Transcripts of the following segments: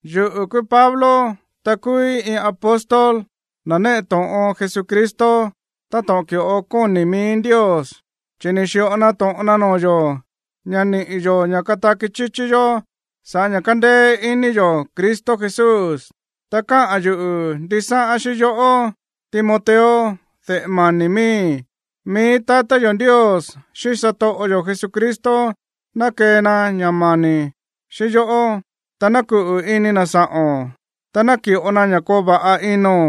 Yuꞌu̱ kúú Pablo, ta kúúí iin apóstol, na̱ néꞌe to̱ꞌon Jesucristo táto̱ꞌon ki̱ꞌo kóni̱ mií Ndios, chi̱ ni̱ xi̱ꞌo na to̱ꞌon na noo̱ yo̱ ña̱ niꞌi̱ yo̱ ña̱ kataki chíchí yó sa̱ꞌá ña̱ kándéé iní yo̱ Cristo Jesús. Ta káꞌa̱n yuꞌu̱ ndisáꞌán xíꞌín yoꞌó, Timoteo, de̱ꞌe mani̱ miíi̱. Mií tatá yo̱ Ndios, xíꞌín satoꞌo yo̱ Jesucristo ná kee na ña̱ mani̱ xíꞌín yoꞌó, ta ná kuꞌu̱ ini na̱ sa̱ꞌo̱n, ta ná ki̱ꞌo na ña̱ koo va̱ꞌa ino̱n.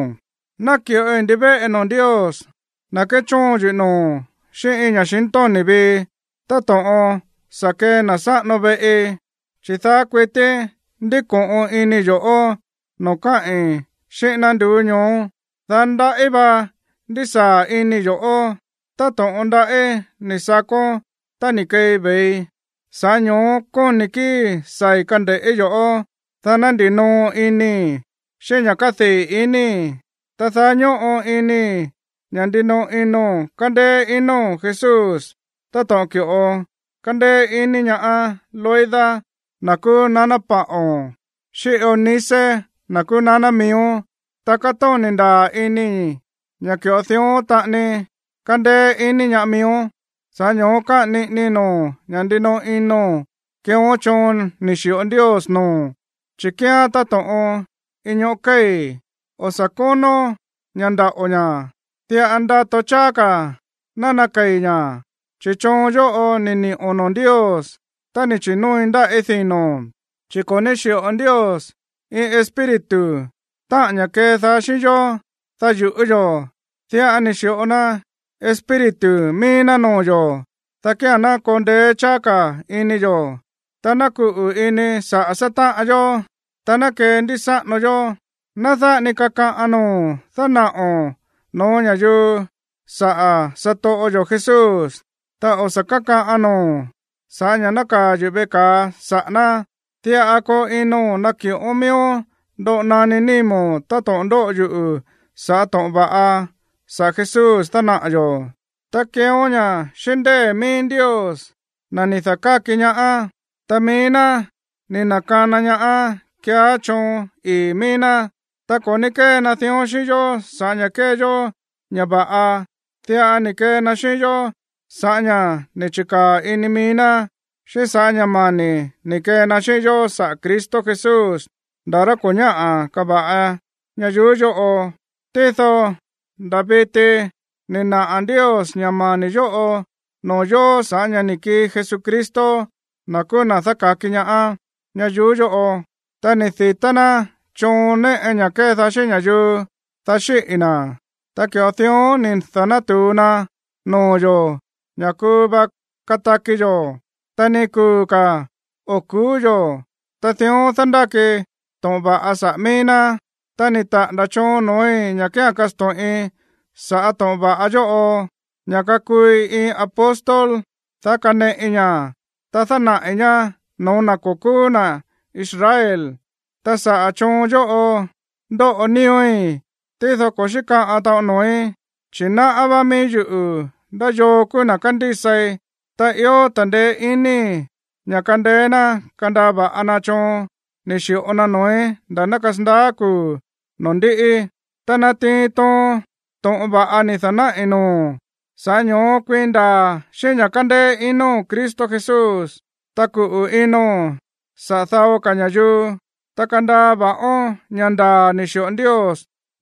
Náki̱ꞌoi ndivéꞌe noo̱ Ndios, na̱ kéchóon yuꞌu̱ noo̱ xíꞌín iin ña̱xintóni̱ vii, táto̱ꞌon sa̱ kee na̱ sáꞌano veꞌi, chi̱ daá kuití ndíko̱ꞌon inii̱ yo̱ꞌó noo̱ káꞌi̱n xíꞌín ná nduú ñoó. Daá ndaꞌí va ndísaa̱ inii̱ yo̱ꞌó, táto̱ꞌon ndaꞌí ni̱ sakón tá ni̱ keei ve̱ii. Sa̱ꞌá ño̱ó kóni̱ kíi̱í saa̱i̱ kande̱ꞌí yo̱ꞌó, dá ná ndinoo inii̱ xíꞌín ña̱ kádii̱ inii̱. Ta daá ñóꞌo inii̱ ña̱ ndinoꞌo ino̱n kándéé ino̱n Jesús táto̱ꞌon ki̱ꞌo kándéé iní ñaá Loida, na̱ kúú naná paꞌo̱n, xíꞌín Eunice, na̱ kúú naná miíón. Ta kátóni̱ ndaa̱ inii̱ ña̱ ki̱ꞌo dión taꞌani kándéé iní ñaá miíón. Sa̱ꞌá ño̱ó káꞌa̱n niꞌinii noo̱o̱n ña̱ ndinoꞌo ino̱n keeón choon ni̱ xi̱ꞌo Ndios noo̱o̱n, chi̱ kíán táto̱ꞌon iin ñóꞌo̱ kéi̱, o̱ sa̱ kónón ña̱ ndaꞌo̱ ña̱, diꞌa ndato cháá ka̱ ná nakei̱ ña̱. Chi̱ choon yóꞌo ni̱ ni̱ꞌo̱n noo̱ Ndios tá ni̱ chi̱nóoi ndáꞌí dino̱n. Chi̱ ko̱ ní xi̱ꞌo Ndios iin espíritu, táꞌa̱n ña̱ kédaá xíꞌín yó, dá yu̱ꞌú yo̱. Diꞌa ni̱ xi̱ꞌo na Espíritu mií ná noo̱ yo̱, dá kía̱n ná koo ndeé cháá ka̱ ini yo̱, ta ná kuꞌu̱ ini saꞌa̱ sátáꞌan yó, ta ná kendísáꞌano yó. Ná dáꞌa ni kakaꞌan noo̱o̱n dánaꞌo̱n no̱ó ña̱yuu saꞌa̱ satoꞌo yo̱ Jesús, ta o̱ sa̱ kákaꞌan noo̱o̱n sa̱ꞌá ña̱ nákaa̱ yuꞌu̱ veꞌe ka̱a saꞌa̱ ná. Diꞌa koo ino̱n ná ki̱ꞌón miíón ndoꞌo naní nímo̱n táto̱ꞌon ndóꞌo yuꞌu̱ saꞌa̱ to̱ꞌon va̱ꞌa saꞌa̱ Jesús dánaꞌa̱ yo̱, ta keeón ña̱ xíꞌín ndée̱ mií Ndios, na̱ ni̱ da̱káki ñaá, ta mií ná ni̱ na̱kana ñaá keeá choon ii̱ mií ná. Ta ko̱ ní kée na dión xíꞌín yó saꞌa̱ ña̱ kée yó ña̱ va̱ꞌa. Diꞌa ni̱ kee na xíꞌín yó sa̱ꞌá ña̱ ni̱ chi̱kaa̱ ini mií ná, xíꞌín sa̱ꞌá ña̱ mani̱ ni̱ kee na xíꞌín yó sa̱ꞌá Cristo Jesús nda̱ rá ko̱ ñáꞌa̱ kava̱ꞌa ñayuú yóꞌo. Tído nda̱ viti ni̱ naꞌa̱ Ndios ña̱ mani̱ yóꞌo noo̱ yo̱ sa̱ꞌá ña̱ ni̱ kii Jesucristo, na̱ kúú na̱ dáka̱ki ñaá, ñayuú yóꞌo. Ta ni̱ di̱tá ná choon néꞌe ña̱ kédaá xíꞌín ña̱yuu, dá xíꞌi̱ na̱. Ta ki̱ꞌo dión ni̱ da̱nátu̱u na noo̱ yo̱ ña̱ kuu va kataki yo̱, ta ni kuu̱ ka̱ o̱ ku̱ú yo̱. Ta dión dándáki to̱ꞌon va̱ꞌa saꞌa̱ mií ná. Ta ni̱ taꞌa̱nda̱ choon noo̱í ña̱ kía̱n kasto̱ꞌin sa̱ꞌá to̱ꞌon va̱ꞌa yóꞌo, ña̱ kakuui iin apóstol, dá kaneꞌi ña̱, ta dánaꞌi̱ ñá no̱ó na̱ ko̱ kúú na̱ Israel. Ta saꞌa̱ choon yóꞌo ndóꞌo nío̱í, tído ko̱ xíkaꞌan taꞌon noo̱í, chi̱ náꞌá va̱ꞌa mií yuꞌu̱ ndá yoo kúú na̱ kándísai, ta ió ta̱ndeé iníi̱ ña̱ kándeé ná kandaa va̱ꞌa na choon ni̱ xi̱ꞌo na noo̱í nda̱ ná kasandaá kuu̱ noo̱ ndíꞌí. Ta natiin toon to̱ꞌon va̱ꞌa ni̱ da̱náꞌi̱ noo̱o̱n. Sa̱ꞌá ño̱ó kuiin ndaa̱ xíꞌín ña̱ kándéé ino̱n Cristo Jesús, ta kuꞌu̱ ino̱n saꞌa̱ dao ka̱ ña̱yuu. Ta kandaa va̱ꞌón ña̱ ndaa̱ ni̱ xi̱ꞌo Ndios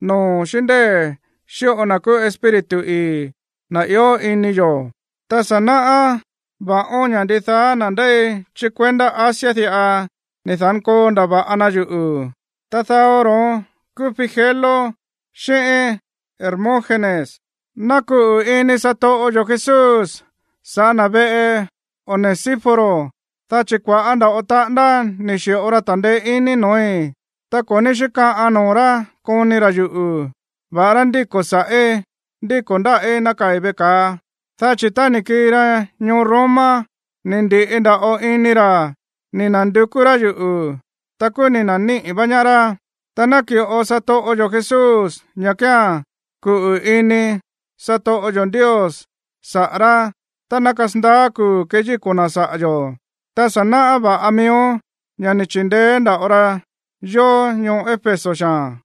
noo̱o̱n xíꞌín ndée̱ xíꞌo na̱ kúú Espíritu ii̱, na̱ ió ini yo̱. Ta sa̱ náꞌá va̱ꞌón ña̱ ndidaá na̱ ndéi chí kuendá Asia diꞌa ni̱ da̱nkoo ndava̱ꞌa na yuꞌu̱, ta dao ro̱ón kúú Figelo xíꞌín Hermógenes. Ná kuꞌu̱ ini satoꞌo yo̱ Jesús sa̱ꞌá na̱ veꞌe Onesíforo, dá chi̱ kua̱ꞌá nda̱ꞌo taꞌándá ni̱ xi̱ꞌo ra ta̱ndeé iní noo̱í, ta ko̱ ní xíkaꞌan noo̱ rá koni ra̱ yuꞌu̱, va̱ꞌará ndíko̱ sa̱ꞌí, ndíko̱ ndáꞌí nákaa̱i̱ veꞌe ka̱a. Dá chi̱ tá ni̱ kii ra ñoo Roma, ni̱ ndi̱ꞌi nda̱ꞌo ini ra̱ ni̱ na̱ndukú rá yuꞌu̱, ta kúú ni̱ na̱níꞌi̱ vá ñaá rá. Ta naki̱ꞌo satoꞌo yo̱ Jesús ña̱ kía̱n kuꞌu̱ ini satoꞌo yo̱ Ndios saꞌa̱ rá tá ná kasandaá kuu̱ keyíko̱ na̱ saꞌa̱ yo̱. Ta sa̱ náꞌá va̱ꞌa miíón ña̱ ni̱ chi̱ndeé nda̱ꞌo ra yó ñoo Éfeso xaa̱n.